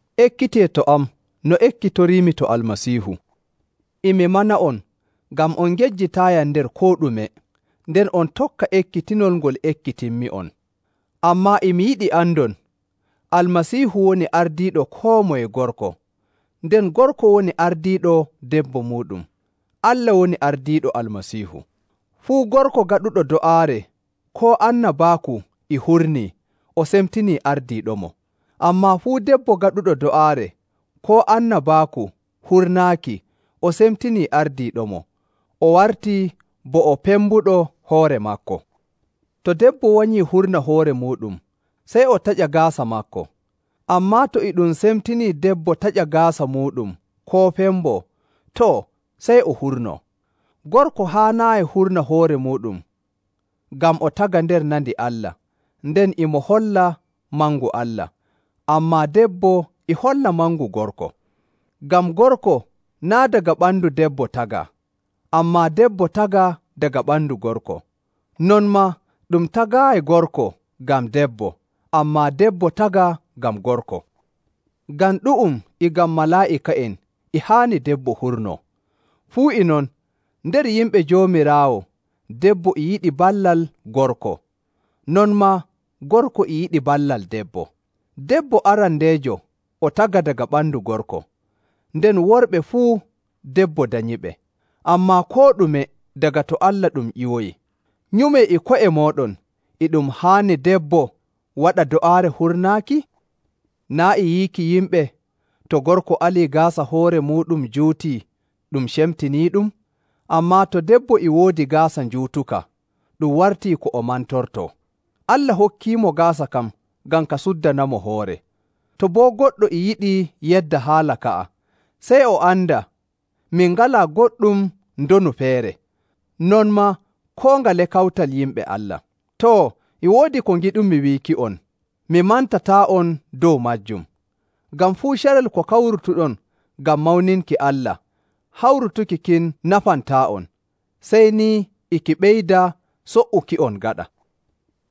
Ekkitee to am no ekkitoriimi to Almasiihu. E mi mana'on ngam on ngejjitaayiyam nder koo ɗume, nden on tokka ekkitinol ngol ekkitinmi'on. Ammaa e mi yiɗi andon, Almasiihu woni ardiiɗo koo moye gorko, nden gorko woni ardiiɗo debbo muuɗum, Allah woni ardiiɗo Almasiihu. Fuu gorko gaɗuɗo do'aare koo annabaaku e hurnii, o semtinii ardiiɗomo. Ammaa fuu debbo gaɗuɗo do'aare koo annabaaku hurnaaki o semtinii ardiiɗomo, o wartii bo o pembuɗo hoore maako. To debbo wanyii hurna hoore muuɗum, sey o taƴa gaasa maako. Ammaa to e ɗum semtinii debbo taƴa gaasa muuɗum koo femboo, too, sey o hurnoo. Gorko haanaayi hurna hoore muuɗum ngam o tagaa nder nandi Allah nden e mo holla mangu Allah, ammaa debbo e holla mangu gorko. Ngam gorko naa' daga ɓandu debbo tagaa, ammaa debbo tagaa daga ɓandu gorko. Non maa ɗum tagaayi gorko ngam debbo, ammaa debbo tagaa ngam gorko. Ngam ɗu'um e ngam malaa'ika'en, e haani debbo hurnoo. Fuu e non, nder yimɓe Joomiraawo debbo e yiɗi ballal gorko, non maa gorko e yiɗi ballal debbo. Debbo arandeejo o tagaa daga ɓandu gorko, nden worɓe fuu debbo danyiɓe, ammaa koo ɗume daga to Allah ɗum ƴiwoyi. Nyumee e ko'e mooɗon, e ɗum haani debbo waɗa do'aare hurnaaki? Naa' e yiiki yimɓe, to gorko alii gaasa hoore muuɗum juutii, ɗum cemtiniiɗum? Ammaa to debbo e woodi gaasa njuutuka, ɗum wartii ko o mantortoo. Allah hokkiimo gaasa kan ngam ka suddanamo hoore. To boo goɗɗo e yiɗi yedda haala ka'a, sey o anda min ngalaa goɗɗum ndonu feere, non maa koo ngale kawtal yimɓe Allah. Too, e woodi ko ngiɗumi wiiki'on, mi mantataa'on dow maajum, ngam fuu carel ko kawrutuɗon ngam mawninki Allah, hawrutuki kin nafantaa'on, sey ni e ki ɓeyda so''uki'on gaɗa.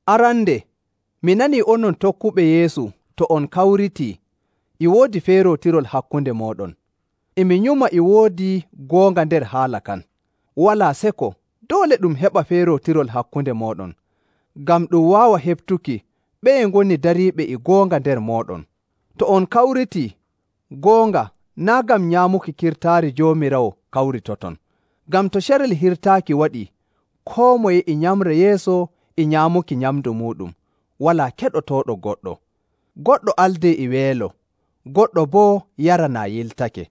Arande, mi nanii onon tokkuɓe Yeesu to on kawritii, e woodi feerootirol hakkunde mooɗon. E mi nyuma e woodi goonga nder haala kan. Walaa seko doole ɗum heɓa feerootirol hakkunde mooɗon, ngam ɗum waawa heɓtuki ɓeye ngoni dariiɓe e goonga nder mooɗon. To on kawritii, goonga naa' ngam nyaamuki kirtaari Joomiraawo kawritoton. Ngam to carel hirtaaki waɗii, koo moye e nyamra yeeso e nyaamuki nyamndu muuɗum, walaa keɗotooɗo goɗɗo. Goɗɗo aldee e weelo, goɗɗo boo yara naa yiltake.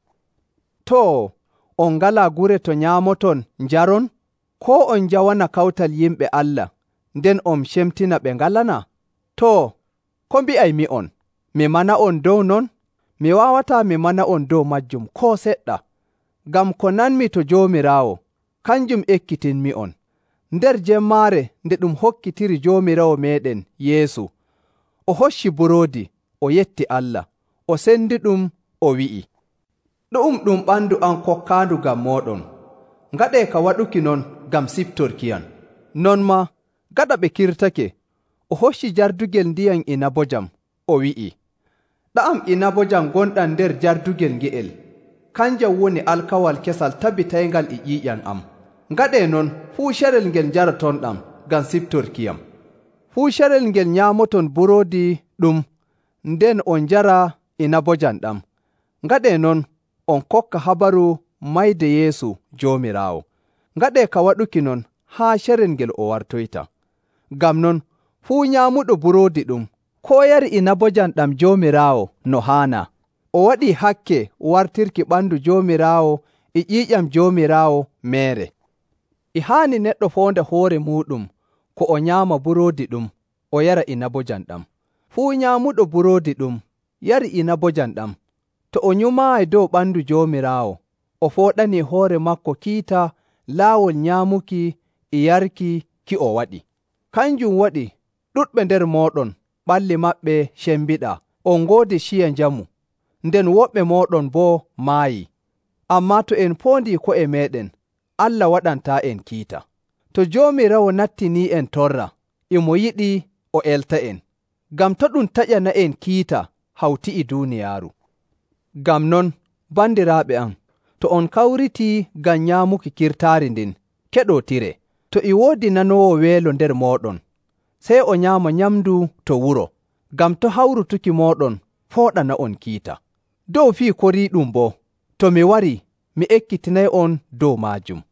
Too, on ngalaa gure to nyaamoton njaron? Koo on njawana kawtal yimɓe Allah, nden on cemtina ɓe ngalanaa? Too, ko mbi'aymi'on? Mi mana'on dow non? Mi waawataa mi mana'on dow maajum koo seɗɗa. Ngam ko nanmi to Joomiraawo, kanjum ekkitinmi'on. Nder jemmaare nde ɗum hokkitiri Joomiraawo meeɗen Yeesu, o hocci buroodi, o yetti Allah, o sendiɗum, o wi'i, “Ɗu'um ɗum ɓandu am kokkaandu ngam mooɗon. Ngaɗee ka waɗuki non ngam siftorkiyam.” Non maa, gaɗa ɓe kirtake, o hocci jardugel ndiyam inabojam, o wi'i, “Ɗa'am inabojam ngonɗam nder jardugel nge'el kanjam woni alkawal kesal tabbitayngal e ƴiiƴam am. Ngaɗee non fuu carel ngel njarotonɗam ngam siftorkiyam.” Fuu carel ngel nyaamoton buroodi ɗum nden on njara inabojam ɗam, ngaɗee non on kokka habaru mayde Yeesu Joomiraawo. Ngaɗee ka waɗuki non haa carel ngel o wartoyta. Ngam non, fuu nyaamuɗo buroodi ɗum, koo yarii inabojam ɗam Joomiraawo no haanaa, o waɗii hakke wartirki ɓandu Joomiraawo e ƴiiƴam Joomiraawo meere. E haani neɗɗo foonda hoore muuɗum ko o nyaama buroodi ɗum o yara inabojam ɗam. Fuu nyaamuɗo buroodi ɗum yari inabojam ɗam, to o nyumaayi dow ɓandu Joomiraawo, o fooɗanii hoore maako kiita laawol nyaamuki e yarki ki o waɗi. Kanjum waɗi ɗuɗɓe nder mooɗon ɓalli maɓɓe cembiɗaa on ngoodi ciya njamu, nden woɓɓe mooɗon boo maayii. Ammaa to en poondii ko'e meeɗen, Allah waɗantaa'en kiita. To Joomiraawo nattinii'en torra, e mo yiɗi o elta'en, ngam to' ɗum taƴana'en kiita hawti e duuniyaaru. Ngam non, bandiraaɓe am, to on kawritii ngam nyaamuki kirtaari ndin, keɗootiree. To e woodi nanoowo weelo nder mooɗon, sey o nyaama nyamndu to wuro, ngam to' hawrutuki mooɗon fooɗana'on kiita. Dow fii koriiɗum boo, to mi warii, mi ekkitinay'on dow maajum.